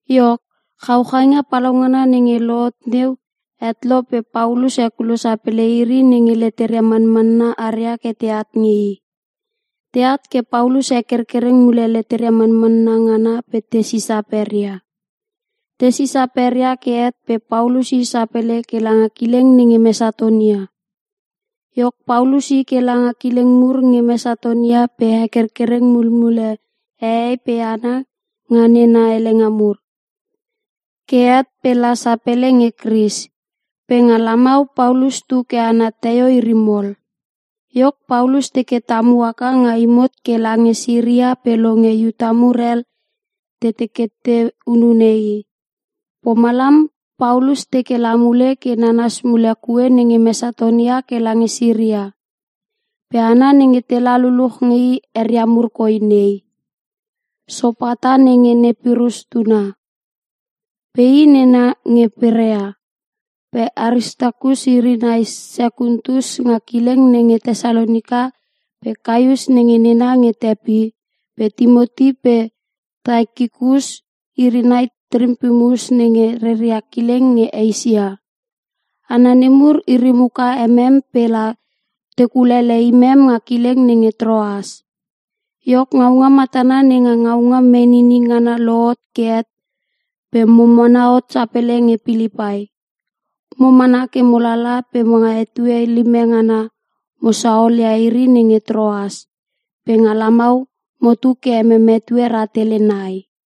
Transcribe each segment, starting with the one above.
Iok, chauchainga palaungana nenge lohot neu het lo pe Paulus hekulo sapele iri nenge leteria manmanna aria ke teat nge i. Teat ke Paulus hekerkereng mule leteria manmanna ngana pe te sisa peria. Te sisa peria ke het pe Paulus i sapele ke langa kileng nenge Mesatonia. Iok Paulus i ke langa kileng mur nge Mesatonia pe hekerkereng mulmule hehei pe hana nga nena helenga mur. Ke het pe la sapele nge Kris. Pe nga lamau Paulus tu ke ana teio iri mol. Iok Paulus teke tamu haka nga imot ke lange Siria pe longe nge Iuta mur hel te teke te hunune i. Pomalam Paulus teke la mule ke nanas mule kue nenge Mesatonia ke lange Siria. Pe hana nenge tela luluch nge i eria mur koi nei, Sopata nenge ne Pirhus tuna. Pe i nena nge Perea. Pe Aristakus iri nai Sekuntus nga kileng nenge Tesalonika pe Kaius nenge nena nge Tepi, pe Timoti pe Taikikus iri nai Trompimus nenge reria kileng nge Eisia. Hana nemur iri muka emem pe la te kulele imem nga kileng nenge Troas. Iok ngaunga matana nenga ngaunga menini ngana lohot ke het pe mo mana hot sapele nge Pilipai. Mo mana ke mo lala pe nga etue lime ngana mo saolia iri nenge Troas. Pe nga lamau motu ke emem etue rahtele nai.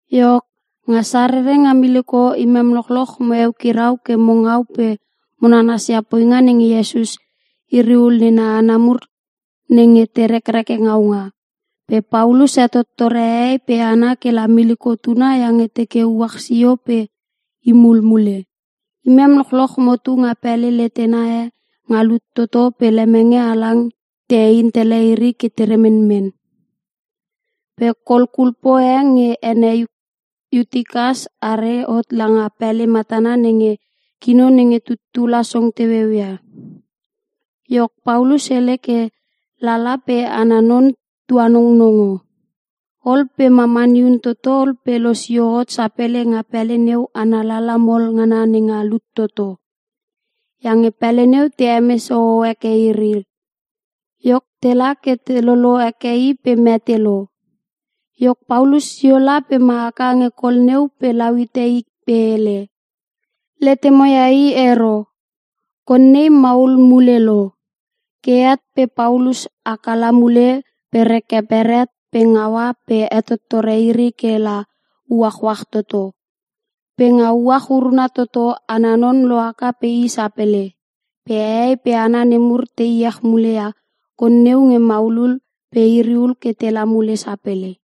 Iok, nga Sarere nga miliko imem lochloch mo eukirau ke mo ngau pe mo nanasia poinga nenge Iesus iriul nena hana mur nenge te rekreke ngaunga. Pe Paulus hetottore hehei pe hana kela miliko tuna iange teke uach sio pe i mulmule. Imem lochloch motu nga pele letena e nga lut toto pe lemenge halang te eintele iri ke te remenmen. Pe kol kulpo e nge ene Iutikas are hot langa pele matana nenge kino nenge tuttula song teueu ia. Iok Paulus hele ke lala pe ana non tuanongnongo. Ol pe mamani hun toto ol pe losio hot sapele nga pele neu ana lala mol ngana nenga lut toto. Iange pele neu te hemes hoho heke iri. Iok tela ke te lolo heke i pe mete lo. Iok Paulus sio la pe ma haka nge kol neu pe lau hite i pe hele, “Letemoia i ero, konei maul mule lo.” Ke het pe Paulus haka la mule pe reke beret pe ngaua pe hetottore iri ke la uachuach toto. Pe nga uach uruna toto ana non lohaka pe i sapele. Pe hehei pe hana nemur te iech mule ia kon neu nge maulul pe iriul ke tela mule sapele.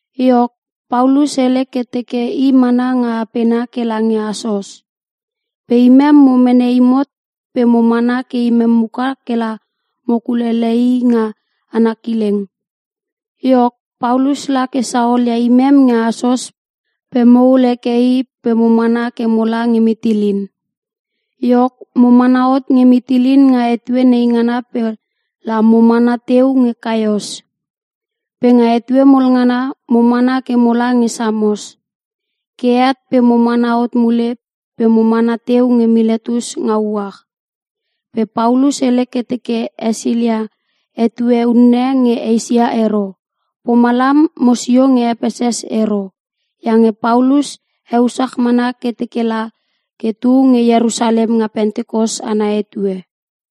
Iok, Paulus hele ke teke i mana nga apena ke lange Asos. Pe imem mo mene imot pe mo mana ke imem muka kela mo kulele i nga ana kileng. Iok, Paulus la ke saolia imem nge Asos pe mohul heke i pe mo mana ke mola nge Mitilin. Iok, mo mana hot nge Mitilin nga etue neingana pe la mo mana teu nge Kaios. Pe nga etue mol ngana mo mana ke mola nge Samos. Ke het pe mo mana hot mule pe mo mana teu nge Miletus nga uach. Pe Paulus hele ke teke hesilia etue unne nge Eisia ero. Pomalam mosio nge Epeses ero. Iange Paulus heusach mana ke teke la ke tu nge Ierusalem nga Pentikos ana etue.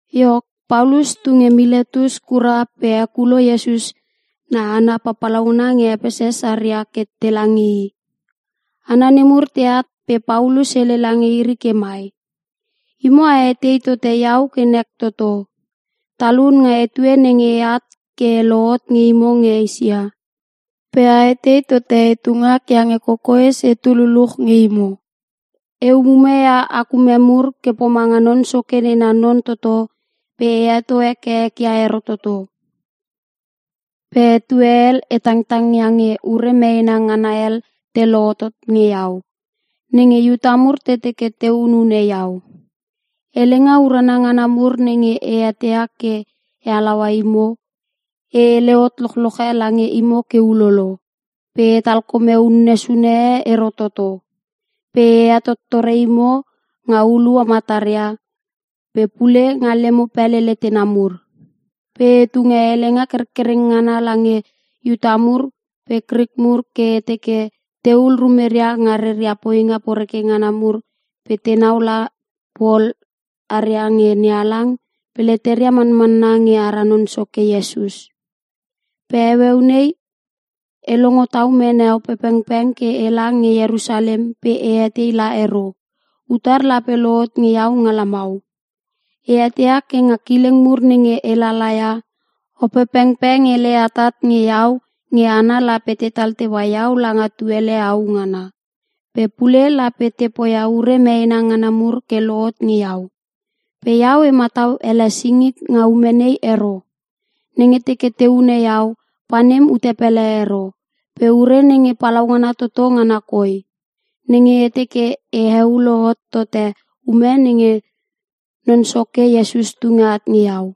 Iok, Paulus tu nge Miletus kura pe hekulo Iesus na hana papalauna nge Epeses aria ke tela nge i. Hana nemur teat pe Paulus hele lange iri ke mai, “Imo a etei tote iau ke nek toto, talun nga etue nenge eat ke e lohot nge imo nge Eisia. Pe a etei tote etu ngak iange kokoes etu luluch nge imo. E umume ia ak ume mur ke pomanga Non Soke nena non toto pe e heto heke ek ia ero toto. Pe etue hel e tangtang iange ure meena ngana hel te lohotot nge iau, nenge Iuta mur te teke te hunune iau. Helenga urana ngana mur nenge e eteia ke e halaua imo, e hele hot lochloche lange imo ke ulolo. Pe etal kome unne sune e ero toto. Pe e hetottore imo nga hulua mataria, pe pule nga lemo pele letena mur. Pe e tunge helenga kerkereng ngana lange Iuta mur pe Krik mur ke e teke tehul rumeria nga reria poinga poreke ngana mur pe tenau la pol aria nge NeHalang pe leteria manmanna nge ara Non Soke Iesus. “Pe heueu nei e longo tau mene Opepengpeng ke ela nge Ierusalem pe e etei la ero, utar lape lohot nge iau nga lamau. E eteia ke nga kileng mur nenge e lalaia, Opepengpeng hele atat nge iau nge hana lape tetal teua iau langa tuele au ngana. Pe pule lape te poia ure meena ngana mur ke lohot nge iau. Pe iau e matau ele singik nga ume nei ero. Nenge teke te hune iau, panem ute pele ero. Pe ure nenge palaungana toto ngana koi; nenge e teke e heulo hot tote ume nenge Non Soke Iesus tunge at nge iau.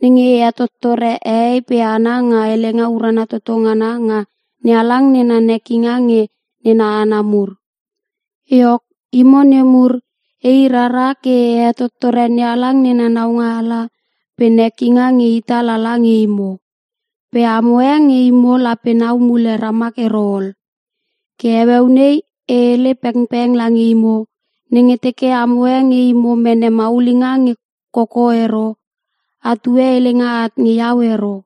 Nenge e hetottore hehei pe hana nga helenga urana toto ngana nga NeHalang nena nekinga nge nena hana mur. “Iok, imo nemur, ei rara ke e hetottore NeHalang nena naualanga pe nekinga nge ita lala nge imo. Pe amo e nge imo lape nau mule ramak ero ol. Ke heueu nei e hele pengpeng lange imo, nenge teke amo e nge imo mene maulinga nge koko ero, atue helenga at nge iau ero.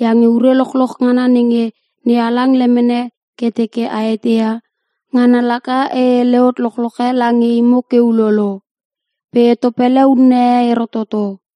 Iange ure lochloch ngana nenge NeHalang lemene ke teke a eteia, ngana laka e hele hot lochloch e lange imo ke ulolo. Pe e topele unne e ero toto.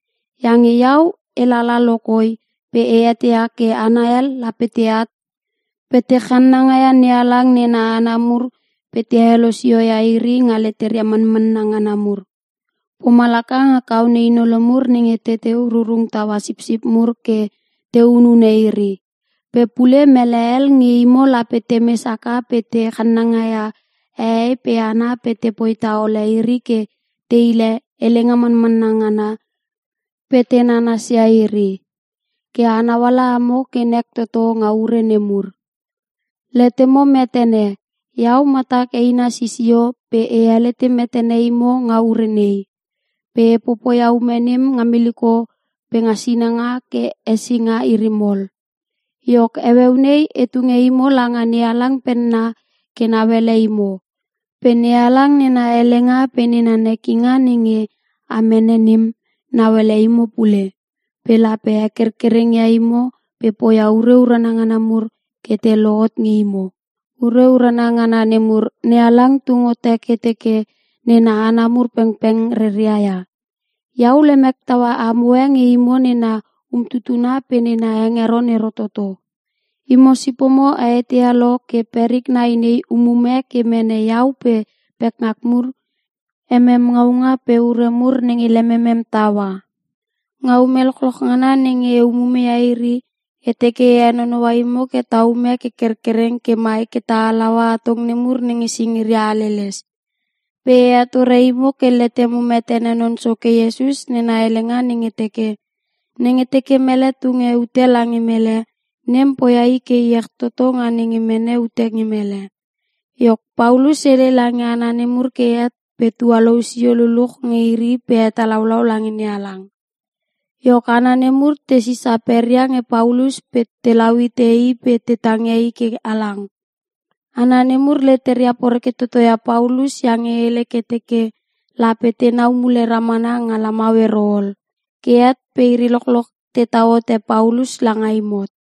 Iange iau, elala lokoi pe e eteia ke hana hel lape teat pe te channanga ia NeHalang nena hana mur pe te helosio ia iri nga leteria manmanna ngana mur, pomalaka nga kaone hinolo mur nenge teteu rurung taua sipsip mur ke te hunune iri. Pe pule mele hel nge imo lape temes haka pe te channanga ia hehei pe hana pe tepoi taole iri ke te hile helenga mamanna ngana pe te nanasia iri. Ke a nauala amo ke nek toto nga ure nemur! Letemo metene, iau matak eina sisio pe e helete metene imo nga ure nei. Pe e popoia ume nem nga miliko pe nga sinanga ke hesinga iri mol. “Iok heueu nei e tunge imo langa NeHalang penna ke nauele imo. Pe NeHalang nena helenga pe nena nekinga nenge a mene nem, nauele imo pule. Pe lape hekerkereng ia imo pe poia ure urana ngana mur ke te lohot nge imo. Ure urana ngana nemur NeHalang tung hote ke teke nena hana mur pengpeng reria ia. Iau lemek taua amoe nge imo nena umtutuna pe nena hengeron ero toto. Imo sipomo a eteia lo ke perik nai nei umume ke mene iau pe pekngak mur emem ngaunga pe ure mur nenge lememem taua. Nga ume lochloch ngana nenge e umume ia iri, e teke e henonoua imo ke ta ume ke kerkereng ke mai ke ta halaua atong nemur nenge singiria haleles. Pe e hetore imo ke letemo metene Non Soke Iesus nena helenga nenge teke, ‘Nenge teke mele tunge ute lange mele, nem poia i ke iech toto nga nenge mene ute nge mele’” Iok Paulus hele lange hana nemur ke het pe tualou sio luluch nge iri pe hetalaulau lange NeHalang. Iok hana nemur te sisa peria nge Paulus pe telau hite i pe te tangia i ke halang. Hana nemur leteria poreke toto ia Paulus iange hele ke teke lape tenau mule ramana nga lamau ero ol. Ke het pe iri lochloch ke tetau hote Paulus langa imot.